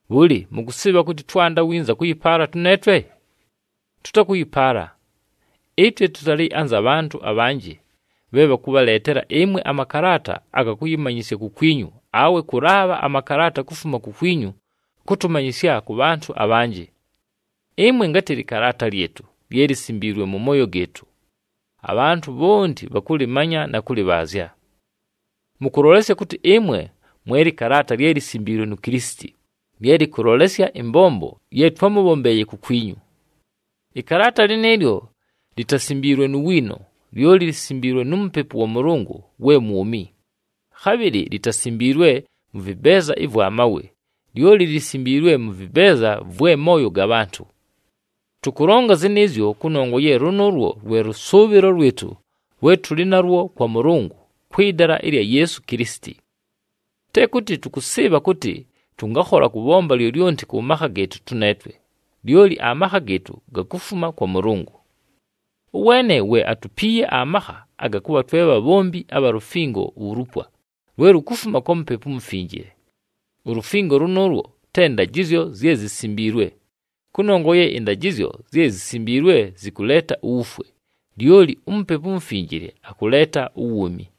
Bhʉlɨ, mʉkʉsɨɨbha kʉtɨ twanda winza kʉyɨpaala tʉneetwe? Tʉtakʉyɨpaala. Ɨtwe tʉtalɨ anza bhantʉ abhanjɨ bhe bhakʉbhaleetela ɨmwe amakalaata aga kʉyɨmanyɨsya kukwinyu awe kʉlaabha amakalaata kufuma kukwinyu kʉtʉmanyɨsya kʉ bhantʉ abhanjɨ. Ɨmwe ngatɨ lɨkalaata lyɨtʉ, lye lisimbiilwe mʉ mooyo gɨɨtʉ. Abhantʉ bhonti bhakʉlɨmanya na kʉlɨbhaazya. Mʉkʉlolesya kʉtɨ ɨmwe mwe lɨkalaata lye lisimbiilwe nu Kilisiti, lye lɨkʉlolesya ɨmbombo ye twámʉbhombeeye kukwinyu. Ɨkalaata lɨnɨɨlyo litasimbiilwe nu wiino, lyoli lisimbiilwe nu Mupepu wa Mʉlʉngʉ we mwumi. Khabhɨlɨ litasimbiilwe mʉ vɨbeeza ɨvwa mawe, lyoli lisimbiilwe mʉ vɨbeeza vwe mooyo ga bhantʉ. Tʉkʉlonga zɨnɨɨzyo kʉnongwa ye lʉnʉʉlwo lwe lʉsʉʉbhɨlo lwɨtʉ lwe tʉlɨ nalwo kwa Mʉlʉngʉ kwɨ dala ɨlya Yeesu Kilisiti. Te kʉtɨ tʉkʉsɨɨbha kʉtɨ tʉngakhola kʉbhomba lyolyonti kʉ makha gɨɨtʉ tʉneetwe, lyoli amakha gɨɨtʉ gakufuma kwa Mʉlʉngʉ. Ʉweene we atupiiye amakha aga kʉbha twe bhabhombi abha lufingo ulupwa, lwe lukufuma kwa Mupepu uMufinjile. Ulufingo lʉnʉʉlwo te ndajɨzyo zye zisimbiilwe, kʉnongwa ye ɨndajɨzyo zye zisimbiilwe zɨkʉleeta uwufwe, lyoli uMupepu uMufinjile akʉleeta uwuumi.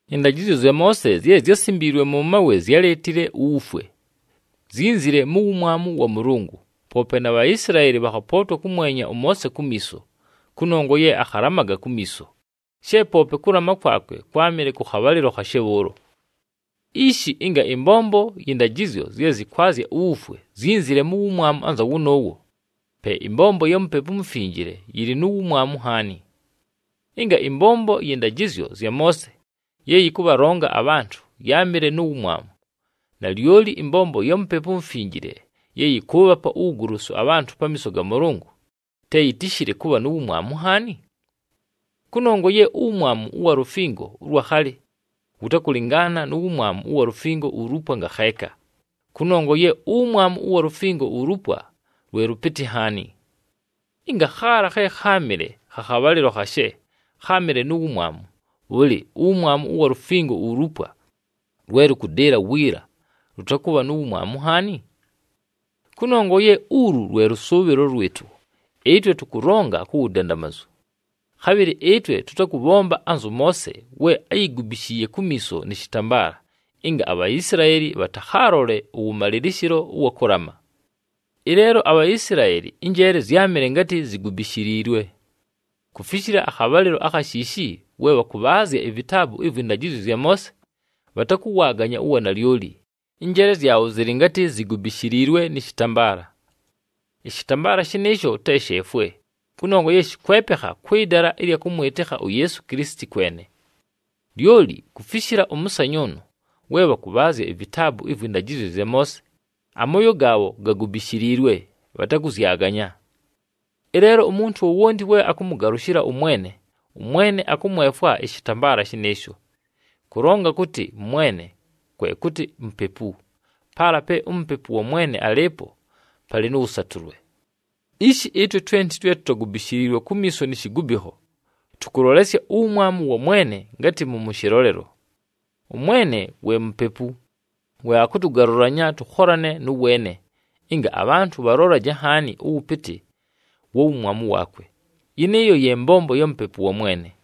Ɨndajɨzyo zya Moose zye zyásimbiilwe mʉ mawe zyáleetile uwufwe. Zyínzile mu wumwamu wa Mʉlʉngʉ, poope na Bhaisilaeli bhakhapootwa kʉmwenya ʉMoose kumiiso, kʉnongwa ye akhalamaga kumiiso, she poope kʉlama kwakwe kwámɨle kʉ khabhalɨlo khashe bhʉʉlo. Ishi, ɨnga ɨmbombo yɨ ndajɨzyo zye zɨkwazya uwufwe zyínzile mu wumwamu anza wʉnʉʉwo, pe ɨmbombo ya Mupepu uMufinjile yɨlɨ nu wumwamu nhaani. Ɨnga ɨmbombo yɨ ndajɨzyo zya Moose ye yɨkʉbhalonga abhantʉ yáamɨle nu wumwamu, nalyoli ɨmbombo ya Mupepu uMufinjile ye yɨkʉʉbhapa uwugolosu abhantʉ pamiiso ga Mʉlʉngʉ, te yitishile kʉbha nu wumwamu nhaani? Kʉnongwa ye uwumwamu ʉwa lufingo ʉlwa khalɨ wʉtakʉlɨngaana nu wumwamu ʉwa lufingo ulupwa ngakheeka, kʉnongwa ye uwumwamu ʉwa lufingo ulupwa, lwe lʉpɨtɨ nhaani. Ɨnga khaala khe kháamɨle kha khabhalɨlo khashe, kháamɨle nu wumwamu, bhʉlɨ, uwumwamu ʉwa lufingo ulupwa lwe lʉkʉdɨɨla wiila lʉtakʉbha nu wumwamu nhaani? Kʉnongwa ye ulu lwe lʉsʉʉbhɨlo lwɨtʉ, ɨtwe tʉkʉlonga ku wudandamazu. Khabhɨlɨ ɨtwe tʉtakʉbhomba anzʉ Moose we áyigubishiiye kumiiso nɨ shɨtambaala, ɨnga aBhaisilaeli bhatakhaalole ʉwʉmalɨlɨshɨlo ʉwa kʉlama. Ɨleelo aBhaisilaeli ɨnjeele zyámɨle ngatɨ zigubishiliilwe. Kufishila akhabhalɨlo akha shiishi we bhakʉbhaazya ivitaabu ɨvwɨ ndajɨzyo zya Moose, bhatakʉwaaganya uwanalyoli, ɨnjeele zyabho zɨlɨ ngatɨ zigubishiliilwe nɨ shɨtambaala. Ɨshɨtambaala shɨnɨɨsho te sheefwe, kʉnongwa ye shɨkwepekha kwɨ dala ɨlya kʉmwɨtɨkha uYeesu Kilisiti kwene. Lyoli kufishila ʉmʉsanyʉʉnʉ, we bhakʉbhaazya ivitaabu ɨvwɨ ndajɨzyo zya Moose, amooyo gaabho gagubishiliilwe, bhatakʉzyaganya. Ɨleelo umuntu wowonti we akʉmʉgalʉshɨla ʉMwene, ʉMwene akʉmwefwa ɨshɨtambaala shɨnɨɨsho. Kʉlonga kʉtɨ, “Mwene,” kwe kʉtɨ, Mupepu, paala pe uMupepu wa Mwene alɨɨpo palɨ nʉ wʉsatʉlwe. Ishi ɨtwe twenti twe tutagubishiliilwe kumiiso ni shigubikho, tʉkʉlolesya uwumwamu wa Mwene ngatɨ mʉmʉ shɨlolelo. ɄMwene we Mupepu, we akʉtʉgalʉlanya tʉkholane nʉ weene, ɨnga abhantʉ bhalolaje nhaani ʉwʉpɨtɨ wa wumwamu waakwe. Yɨnɨɨyo ye mbombo ya Mupepu wa Mwene.